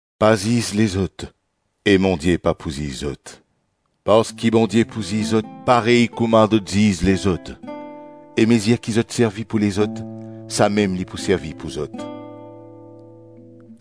“Pa ziz lezot e Bondie pa pou ziz zot. Parski Bondie pou ziz zot parey kouma zot ziz lezot e mezir ki zot servi pou lezot, samem li pou servi pou zot.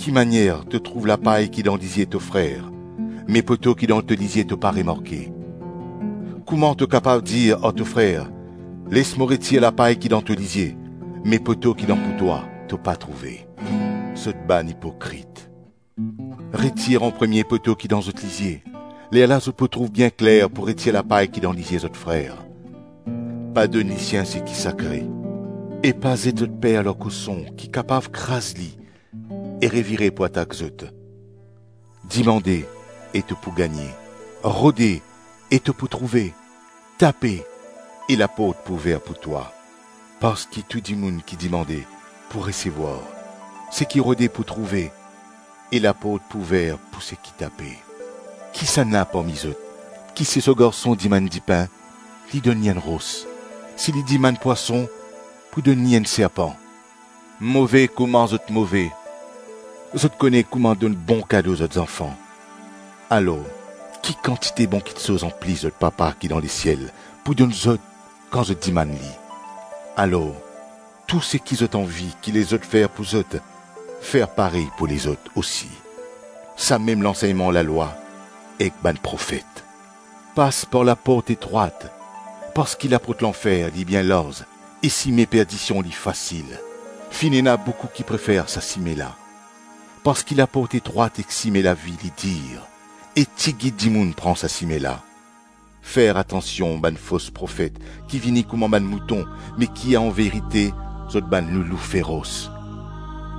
Ki manier to trouv lapay ki dan lizie to frer, me poto ki dan to lizie to pa remarke. Kouma to kapav dir ar to frer, les mo retir lapay ki dan to lizie me poto ki dan pou twa, to pa trouve? Zot bann ipokrit, retir anpremie poto ki dan zot lizie, lerla zot pou trouv bien kler pou retir lapay ki dan lizie zot frer. Pa donn lisien seki sakre, e pa zet zot perl ar koson ki kapav kraz li e revire pou atak zot. Dimande, e to pou gagne, rode e to pou trouve, tape e laport pou ouver pou twa. Parski tou dimoun ki dimande pou resevwar, seki rode pou trouve, e laport pou ouver pou seki tape. Kisannla parmi zot, ki si so garson dimann dipin, li donn li enn ros; si li dimann pwason, pou donn li enn serpan? Move kouma zot move, zot kone kouma donn bon kado zot zanfan, alor ki kantite bon kiksoz anplis zot Papa ki dan lesiel pou donn zot kan zot dimann li. Alor tou seki zot anvi ki lezot fer pou zot, fer parey pou lezot osi, samem lansegnman lalwa ek bann profet. Pas par laport etrwat, parski laport lanfer li bien larz e sime perdision li fasil. Finn ena boukou ki prefer sa sime la. Parski laport etrwat ek sime lavi li dir, e tigit dimoun pran sa sime la. Fer atansion bann fos profet ki vini kouma bann mouton me ki anverite zot bann loulou feros.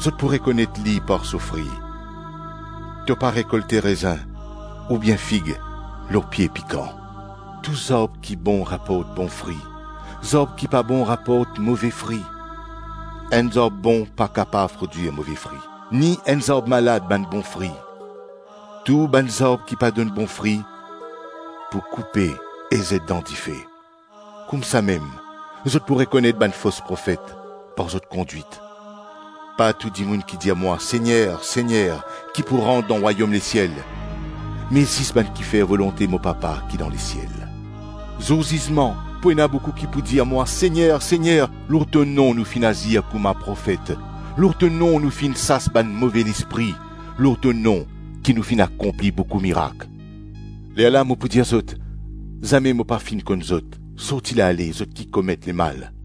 Zot pou rekonet li par so fri. To pa rekolte rezin oubien fig lor pie pikan. Tou zarb ki bon raport bon fri, zarb ki pa bon raport move fri. Enn zarb bon pa kapav prodwir move fri, ni enn zarb malad bann bon fri. Tou bann zarb ki pa donn bon fri, pou koupe e zet dan dife. Koumsamem zot pou rekonet bann fos profet, par zot kondwit.” “Pa tou dimoun ki dir mwa, ‘Segner, Segner’ ki pou rant dan rwayom lesiel, me zis bann ki fer volonte mo papa ki dan lesiel. Zour zizman, pou ena boukou ki pou dir mwa ‘Segner, Segner, lor to nom nou finn azir kouma profet, lor to nom nou finn sas bann move lespri, lor to nom ki nou finn akonpli boukou mirak.’ Lerla li pou dir zot, ‘Zame mo pa finn konn zot; sorti la ale, zot ki komet lemal.’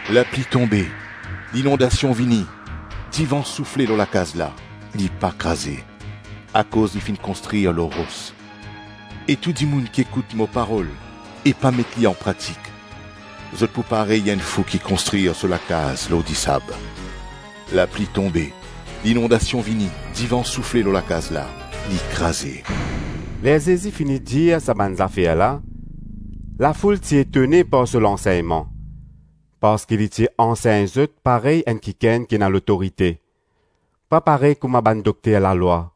Lapli tonbe, linondasion vini, divan soufle lor lakaz la, li pa kraze, akoz li finn konstrir lor ros. E tou dimoun ki ekout mo parol e pa met li anpratik, zot pou parey enn fou ki konstrir so lakaz lor disab. Lapli tonbe, linondasion vini, divan soufle lor lakaz la, li kraze.” Ler Zezi fini dir sa bann zafer la, lafoul ti etone par so lansegnman, parski li ti ansegn zot parey enn kikenn ki ena lotorite, pa parey kouma bann dokter lalwa.